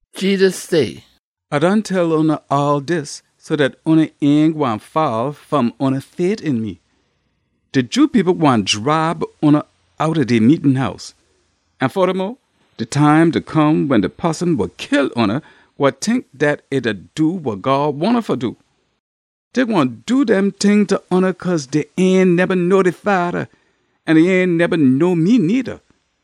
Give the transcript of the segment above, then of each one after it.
Jedus say, “A done tell oona all dis so dat oona ain gwine fall fom oona fait een me. De Jew people gwine dribe oona outta dey meetin house. An fodamo, de time da come wen de poson wa kill oona gwine tink dat e da do wa God wahn um fa do. Dey gwine do dem ting ta oona cause dey ain neba know de Fada, an dey ain neba know me needa.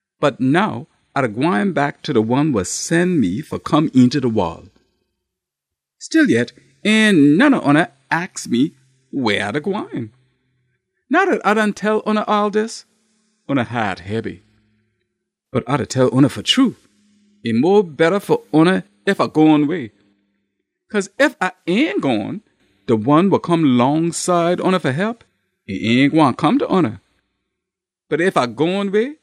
Bot now A da gwine back ta de one wa sen me fa come eenta de wol. Stillyet, ain none ob oona aks me weh A da gwine. Now dat A done tell oona all dis, oona haat hebby. Bot A da tell oona fa true, e mo betta fa oona ef A gone way. Cause ef A ain gone, de One wa come longside oona fa hep, e ain gwine come ta oona. Bot ef A gone way,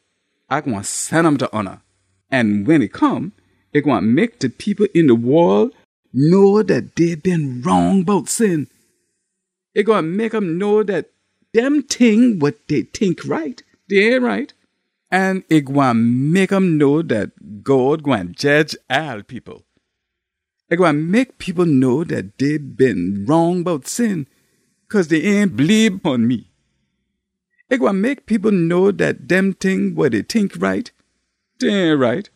A gwine sen um ta oona. An wen e come, e gwine mek de people een de wol know dat dey been wrong bout sin. E gwine mek um know dat dem ting wa dey tink right, dey ain right. An e gwine mek um know dat God gwine jedge all people. E gwine mek people know dat dey been wrong bout sin, cause dey ain bleebe pon me. E gwine mek people know dat dem ting wa dey tink right, dey ain right,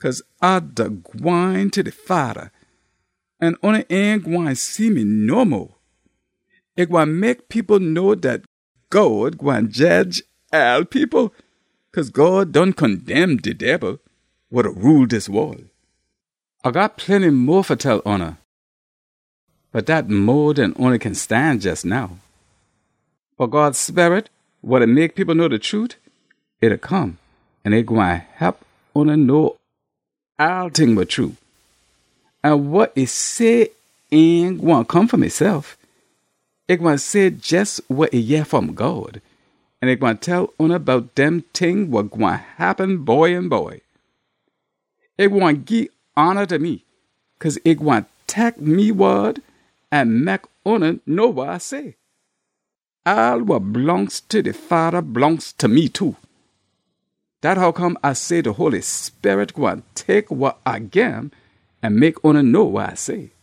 cause A da gwine ta de Fada, an oona ain gwine see me no mo. E gwine mek people know dat God gwine jedge all people, cause God done condemn de Debil, wa da rule dis wol. “A got plenty mo fa tell oona, bot dat mo den oona kin stan jes now. Bot God Sperit wa da mek people know de trute, e da come an e gwine hep oona know all ting wa true. An wa e say ain gwine come fom esef. E gwine say jes wa e yeh fom God, an e gwine tell oona bout dem ting wa gwine happen by an by. E gwine gii hona ta me, cause e gwine tek me wod an mek oona know wa A say. All wa blongst ta de Fada blongst ta me too. Dat hoccome A say de Holy Sperit gwine tek wa A gim an mek oona know wa A say.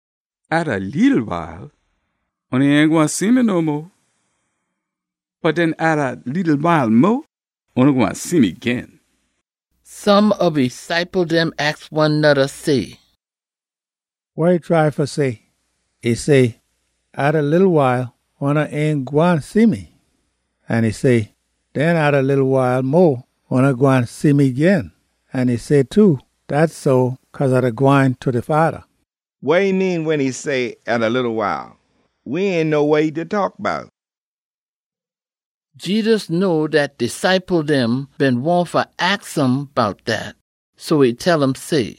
“Atta leetle wile, oona ain gwine see me no mo. Bot den atta leetle wile mo, oona gwine see me gin.” Some ob e ciple dem aks one noda say, “Wa e try fa say? E say, ‘Atta leetle wile, oona ain gwine see me.’ An e say, ‘Den atta leetle wile mo, oona gwine see me gin.’ An e say too, ‘Dat so cause A da gwine ta de Fada.’ Wa e mean wen e say ‘Atta leetle wile?’ We ain know wa e da taak bout!” Jedus know dat de ciple dem been wahn fa aks um bout dat, so e tell um say,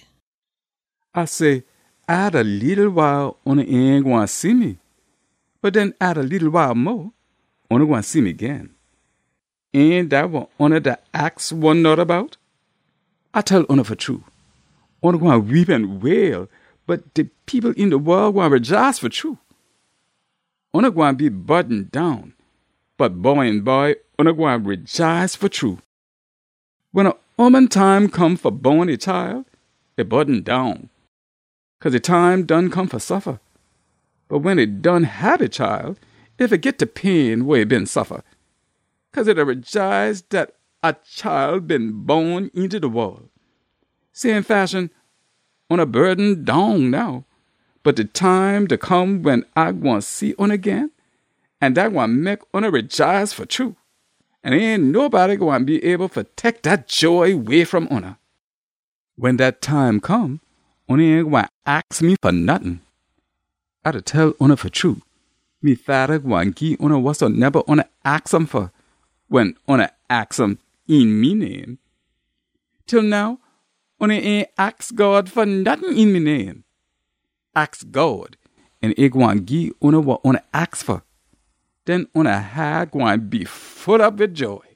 “A say, ‘Atta leetle wile oona ain gwine see me, bot den atta leetle wile mo, oona gwine see me gin.’ Ain dat wa oona da aks one noda bout? A tell oona fa true. Oona gwine weep an wail, bot de people een de wol gwine rejaice fa true. Oona gwine be burden down, bot by an by oona gwine rejaice fa true. Wen a ooman time come fa bon e chile, e burden down, cause e time done come fa suffa. Bot wen e done hab e chile, e fagit de pain wa e been suffa, cause e da rejaice dat a chile been bon eenta de wol. Same fashion, oona burden down now. Bot de time da come wen A gwine see oona gin, an dat gwine mek oona rejaice fa true. An ain nobody gwine be able fa tek dat joy way fom oona. “Wen dat time come, oona ain gwine aks me fa nottin. A da tell oona fa true, me Fada gwine gii oona wasoneba oona aks um fa, wen oona aks um een me name. Til now, oona ain aks God fa nottin een me name. Aks God an e gwine gii oona wa oona aks fa. Den oona haat gwine be full op wid joy.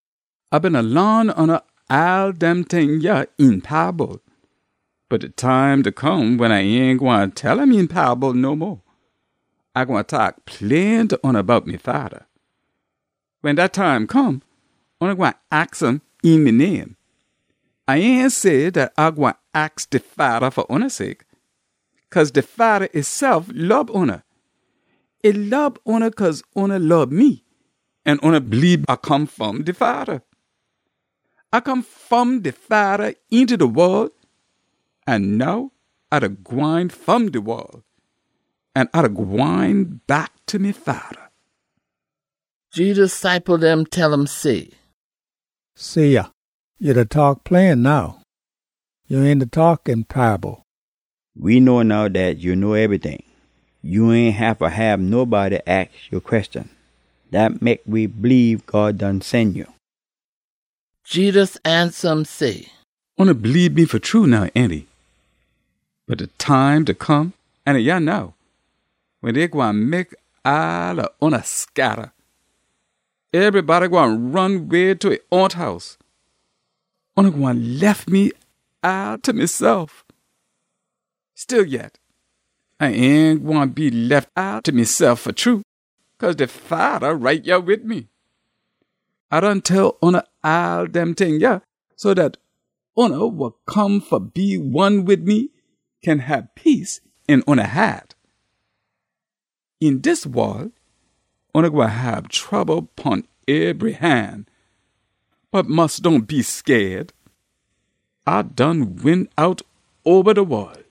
“A beena laan oona all dem ting yah een paable. Bot de time da come wen A ain gwine tell um een paable no mo. A gwine taak plain ta oona bout me Fada. Wen dat time come, oona gwine aks um een me name. A ain say dat A gwine aks de Fada fa oona sake. Cause de Fada esef lob oona. E lob oona cause oona lob me an oona bleebe A come fom de Fada. A come fom de Fada eenta de wol, an now A da gwine fom de wol an A da gwine back ta me Fada.” Jedus ciple dem tell um say, “See yah, ya da taak plain now. Ya ain da taak een paable. We know now dat ya know ebryting. Ya ain haffa hab nobody aks ya queshon. Dat mek we bleebe God done sen ya.” Jedus ansa um say, “Oona bleebe me fa true now, ainty? Bot de time da come, an e yah now, wen dey gwine mek all ob oona scatta. Ebrybody gwine ron way ta e own house. Oona gwine lef me all ta mesef. Stillyet, A ain gwine be lef all ta mesef fa true, cause de Fada right yah wid me. A done tell oona all dem ting yah so dat oona wa come fa be one wid me kin hab peace een oona haat. Een dis wol oona gwine hab trouble pon ebry han, bot mus dohn be scaid! A done win out oba de wol!”